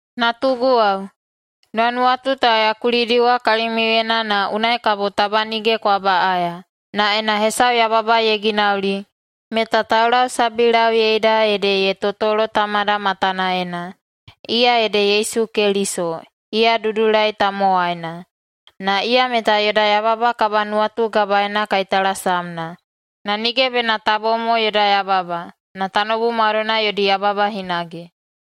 Natuguwao, nuwanuwatu ta ya kulidiwa kalimiuyena na unai kabo taba nige kwa baꞌaya. Na ena hesau yababa ye ginauli, meta taulausabilauyeida ede ye totolo Tamada matanaena, iya ede Yesu Keliso, iya dudulai tamowaina. Na iya meta yoda yababa kabanuwatugabaena kaitalasamna. Na nige bena ta bom mo yoda yababa, na tanoubu maudoina yodi yababa hinage.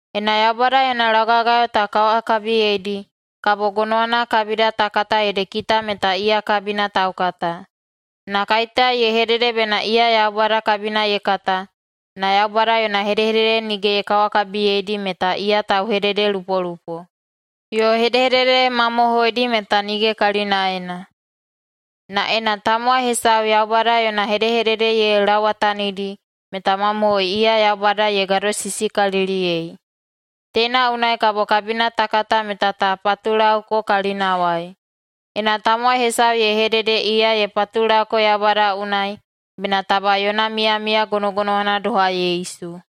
Ena Yaubada yona laugagayo ta kawakabiyeidi, kabo gonowana kabida ta kata ede kita meta iya kabina taukata. Na kaiteya ye hedede bena iya Yaubada kabina ye kata, na Yaubada yona hedehedede nige ye kawakabiyeidi, meta iya tauhededelupolupo, yo hedehedede mamohoidi meta nige kalinaena. Na ena tamowai hesau Yaubada yona hedehedede ye lauwatanidi, meta mamohoi iya Yaubada ye gadosisikaliliyei. Teina unai kabo kabina ta kata meta ta patulauko kalinawai: Ena tamowai hesau ye hedede iya ye patulauko Yaubada unai, bena taba yona miyamiya gonogonowana doha Yesu.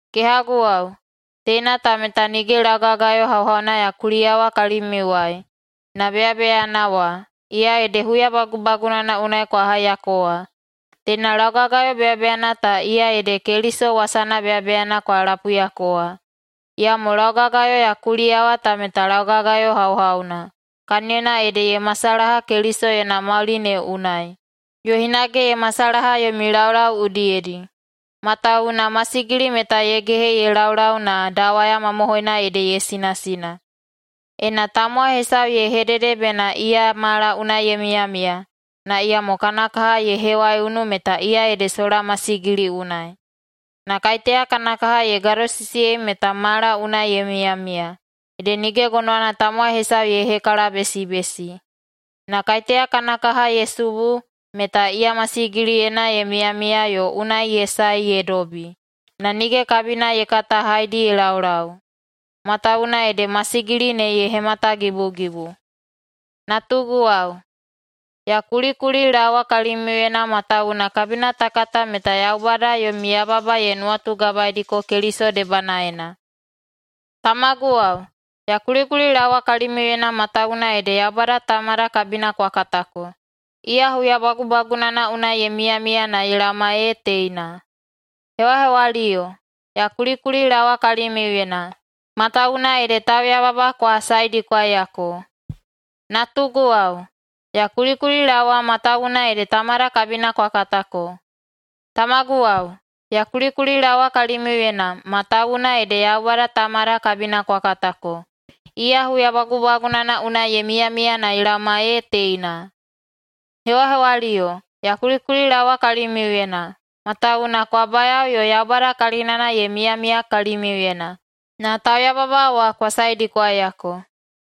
Kehaguwao, teina ta meta nige laugagayo hauhauna ya kuliyawa kalimiuwai, na beyabeyana wa, iya ede huya bagubagunana unai kwa haiyako wa. Teina laugagayo beyabeyana ta, iya ede Keliso wasana beyabeyana kwa lapuiyako wa. Iyamo laugagayo ya kuliyawa ta meta laugagayo hauhauna, kaniyona ede ye masalaha Keliso yona mauli ne unai, yo hinage ye masalaha yomi laulau udiyedi. Matawuwuna masigili meta ye gehe ye laulau na dawaya mamohoina ede ye sinasina. Ena tamowai hesau ye hedede bena iya mala unai ye miyamiya, na iyamo kana kaha ye hewaiunu, meta iya ede sola masigili unai. Na kaiteya kana kaha ye gadosisiyei meta mala unai ye miyamiya, ede nige gonowana tamowai hesau ye hekalabesibesi. Na kaiteya kana kaha ye subu, meta iya masigiliyena ye miyamiya yo unai ye sae ye dobi, na nige kabina ye kata haedi ye laulau, matawuwuna ede masigili ne ye hematagibugibu. Natuguwao, ya kulikulilaowa kalimiuyena matawuwuna kabina ta kata meta Yaubada yomi yababa ye nuwatugabaediko Keliso debanaena. Tamaguwao, ya kulikulilaowa kalimiuyena matawuwuna ede Yaubada Tamada kabina kwa katako. Iya huya bagubagunana unai ye miyamiya na ye laoma ee teina. Hewahewaliyo, ya kulikulilaowa kalimiuyena, matawuwuna ede tauyababa kwa saedikwaiyako. Natuguwao, ya kulikulilaowa matawuwuna ede Tamada kabina kwa katako. Tamaguwao, ya kulikulilaowa kalimiuyena matawuwuna ede Yaubada Tamada kabina kwa katako. Iya huya bagubagunana unai ye miyamiya na ye laoma ee teina. Hewahewaliyo, ya kulikulilaowa kalimiuyena matawuwuna kwa bayao yo Yaubada kalinana ye miyamiya kalimiuyena, na tauyababa wa kwa saedikwaiyako.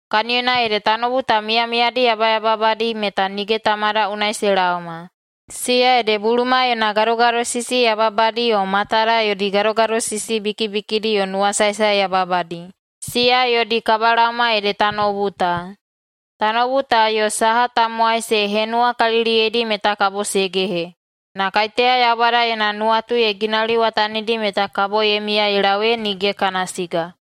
Kaniyona ede tanoubu ta miyamiyadi yababadi meta nige Tamada unai se laoma, siya ede buluma yona gadogadosisi yababadi yo matada yodi gadogadosisi bikibikidi yo nuwasaesae yababadi. Siya yodi kabalaoma ede tanoubu ta. Tanoubu ta yo saha tamowai se henuwakaliliyeidi meta kabo se gehe, na kaiteya Yaubada yona nuwatu ye ginauliwatanidi meta kabo ye miya ye lau ee nige kana siga.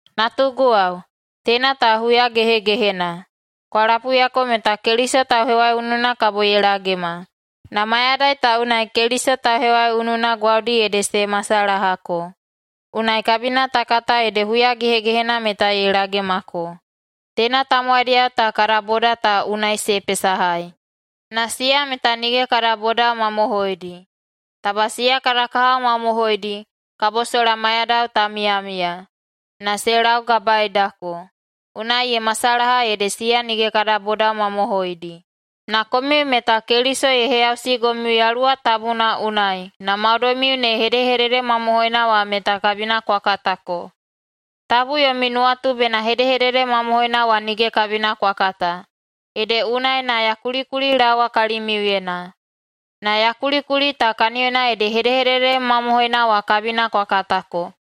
Natuguwao, teina ta huya gehegehena. Kwa lapuiyako meta Keliso tauhewaiununa kabo ye lagema. Na mayadai ta unai Keliso tauhewaiununa gwaudi ede se masalahako. Unai kabina ta kata ede huya gehegehena meta ye lagemako. Teina tamowaidiyao ta kada boda ta unai se pesahai, na siya meta nige kada bodao mamohoidi. Taba siya kada kahao mamohoidi, kabo sola maiyadao ta miyamiya. Na se laugabaedako, unai ye masalaha ede siya nige kada bodao mamohoidi. Na komiu meta Keliso ye heyausigomiu Yaluwa Tabuna unai na maudoimiu ne hedehedede mamohoina wa meta kabina kwa katako. Tabu yomi nuwatu bena hedehedede mamohoina wa nige kabina kwa kata, ede unai na ya kulikulilaowa kalimiuyena. Na ya kulikuli ta kaniyona ede hedehedede mamohoina wa kabina kwa katako,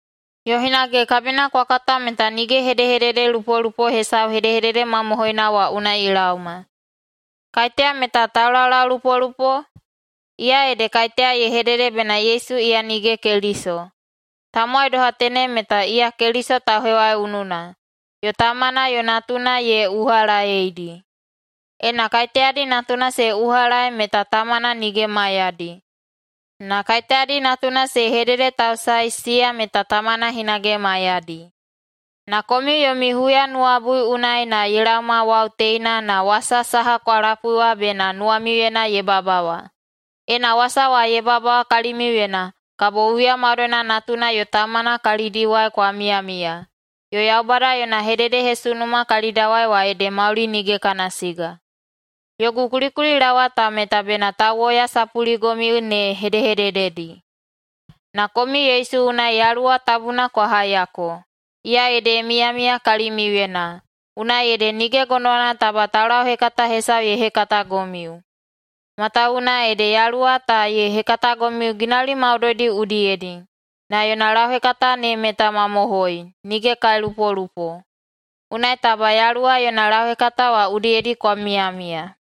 yo hinage kabina kwa kata meta nige hedehededelupolupo hesau hedehedede mamohoina wa unai ye laoma. Kaiteya meta taulaulaulupolupo? Iya ede kaiteya ye hedede bena Yesu iya nige Keliso. Tamowai doha tenem meta iya Keliso tauhewaiununa, yo Tamana yo Natuna ye uhalaedi. Ena kaiteyadi Natuna se uhalaei meta Tamana nige maiyadi. Na kaiteyadi Natuna se hededetausaei, siya meta Tamana hinage maiyadi. Na komiu yomi huyanuwabui unai na ye laoma wau teina na wasa saha kwa lapui wa bena nuwamiuyena ye babawa. Ena wasa wa ye babawa kalimiuyena, kabo huya maudoina Natuna yo Tamana kalidiwai kwa miyamiya, yo Yaubada yona hededehesunuma kalidawai wa ede mauli nige kana siga. Yogu kulikulilaowa ta meta bena tauwoyasapuligomiu ne hedehedededi. Na komiu Yesu unai Yaluwa Tabuna kwa haiyako, iya ede ye miyamiya kalimiuyena, unai ede nige gonowana taba taulauhekata hesau ye hekatagomiu. Matawuwuna ede Yaluwa ta ye hekatagomiu ginauli maudoidi udiyedi, na yona lauhekata ne meta mamohoi, nige kailupolupo. Unai taba Yaluwa yona lauhekata wa udiyedi kwa miyamiya.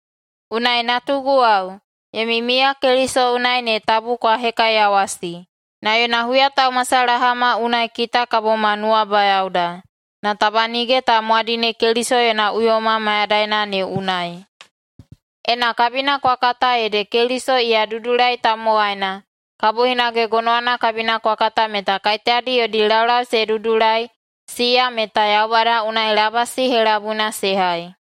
Unai, natuguwao, yomi miya Keliso unai ne tabu kwa hekaiyawasi. Na yona huyataumasalahama unai kita kabo ma nuwabayaoda, na taba nige ta mwadine Keliso yona uyoma mayadaina ne unai. Ena kabina kwa kata ede Keliso iya dudulai tamowaina, kabo hinage gonowana kabina kwa kata meta kaiteyadi yodi laulau se dudulai, siya meta Yaubada unai labasi helabuina se hai.